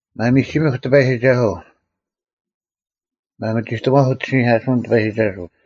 ᒪᒥᒋᒥᐧᒄ ᑎᐸᔨᒋᒐᓱᐤ! ᒪᒥᒋᑕᒺᒄ ᐅᑦ ᐃᓯᓂᐧᑲᓱᐅᓐ ᑎᐸᔨᒋᒐᓱᐤ;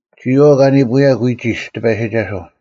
ᒋᔨᐛᐤ ᑲ ᓂᐳᐅᔭᒄ ᐎᒋᒡ ᑎᐸᔨᒋᒐᓱᐤ,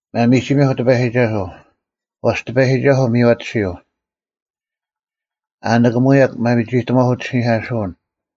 ᒪᒥᒋᒥᐧᒄ ᑎᐸᔨᒋᒐᓱᐤ; ᐛᔅ ᑎᐸᔨᒋᒐᓱᐤ ᒥᔽᑎᓯᐤ: ᐊ ᓂᑭᒧᔭᒄ ᒪᒥᒋᑕᒺᐧᒄ ᐅᑦ ᐃᓯᓂᐧᑲᓱᐅᓐ;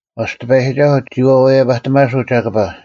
ᐛᔅ ᑎᐸᔨᒋᒐᓱᐤ ᒋ ᐛᐛᔭᐸᑎᒪᓱᐤ ᒐᑭᐸ,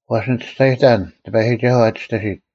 ᐛᔅ ᓂ ᒋᔅᒐᔨᑕᓐ ᑎᐸᔨᒋᒐᓱᐤ ᐊ ᒋᔅᑎᓯᑦ,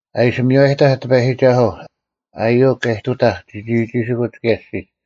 ᐊ ᐃᓯ ᒥᔽᔨᑕᐧᒃ ᑎᐸᔨᒋᒐᓱᐤ, ᐊᔪᐅᒄ ᑲ ᐃᑐᑕᐧᒃ ᒋᒋᒋᓯᑯᒡ ᑭᔭ ᐊᔅᒋᒡ,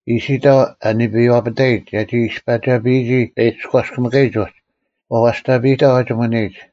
ᐃᓯᑕᐤ ᐊ ᓂᐱᐛᐸᑕᔨᒡ ᒐᒋ ᐃᔅᐸᒐᐱᔨᒋ ᐊ ᐃᔎᔅᑭᒥᑲᔨᒡ ᐅᒡ, ᐛᐛᔅᑕᐸᔨᑕᐤ ᐊ ᒋᒧᓂᔨᒡ;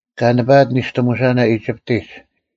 ᑲ ᓂᐸᐊᑦ ᓂᔅᑎᒧᓴᓇ ᐃᒋᑉᑎᒡ,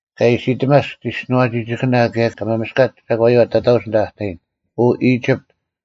ᑲ ᐃᓯᑎᒪᔅᒃ ᒋᔅᒋᓄᐛᒋᒋᑭᓇ ᑭᔭ ᑲ ᒪᒥᔅᑲᒡ ᒐᒂᔪᐛ ᑕᑕᐅᒡ ᐊᓐᑕ ᐊ ᑕᔨᓐ, ᐅ ᐃᒋᑉᑦ,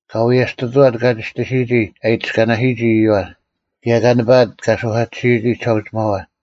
ᑲ ᐎᔭᔅᑐᑐᐛᑦ ᑲ ᒋᔅᑎᓯᔨᒋ ᐊ ᐃᑎᔅᑲᓇᓯᔨᒋ ᐃᔪᐛ, ᑭᔭ ᑲ ᓂᐸᐊᑦ ᑲ ᓱᐧᑲᑎᓯᔨᒋ ᒋᓴᐅᒋᒪᐛ;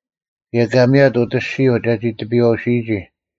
ᑭᔭ ᑲ ᒥᔭᑦ ᐅᑦ ᐊᔅᒋᔪᐤ ᒐᒋ ᑎᐱᔨᐛᐅᓯᔨᒋ,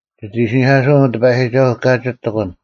ᒋᑦ ᐃᓯᓂᑲᓯᐅᓐ, ᐅ ᑎᐸᔨᒋᒐᓱᐤ, ᑲᒋᒡ ᑎᒂᓐ;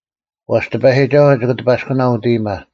ᐛᔅ ᑎᐸᔨᒋᒐᓱᐤ ᒋᑭ ᑎᐸᔅᑯᓇᐤ ᐅᑦ ᐃᔨᒪ,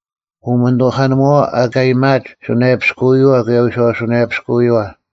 ᐅᒥᓂᑐᐧᑲᓂᒧᐛᐛ ᐊᑲ ᐊᔭᒥᐊᒡ ᓱᓇᔭᐱᔅᑯᐎᔪᐛ ᑭᔭ ᐎᔄᐅᓱᓇᔭᐱᔅᑯᐎᔪᐛ,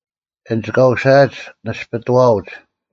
ᐊᓐᒡ ᑲ ᐅᓯᐊᒡ ᓇᔅᐱᑐᐛᐅᒡ;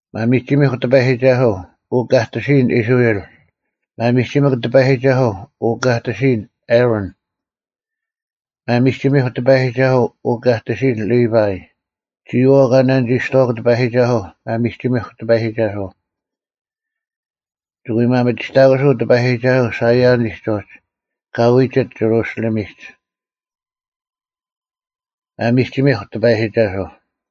ᒪᒥᒋᒥᐧᒄ ᑎᐸᔨᒋᒐᓱᐤ, ᐅ ᑲ ᑎᓯᔨᓐ ᐃᔅᕋᐃᓪ; ᒪᒥᒋᒥᐧᒄ ᑎᐸᔨᒋᒐᓱᐤ, ᐅ ᑲ ᑎᓯᔨᓐ ᐊᕋᓐ: ᒪᒥᒋᒥᐧᒄ ᑎᐸᔨᒋᒐᓱᐤ, ᐅ ᑲ ᑎᓯᔨᓐ ᓕᐸᐃ: ᒋᔨᐛᐤ ᑲ ᓇᓂᒋᔅᑐᐛᒄ ᑎᐸᔨᒋᒐᓱᐤ, ᒪᒥᒋᒥᐧᒄ ᑎᐸᔨᒋᒐᓱᐤ! ᒋᑭ ᐎ ᒪᒥᒋᑕᑯᓱᐤ ᑎᐸᔨᒋᒐᓱᐤ ᓴᐃᔭᓂᒡ ᐅᒡ, ᑲ ᐎᒋᑦ ᒋᕈᓯᓕᒥᒡ᙮ ᒪᒥᒋᒥᐧᒄ ᑎᐸᔨᒋᒐᓱᐤ!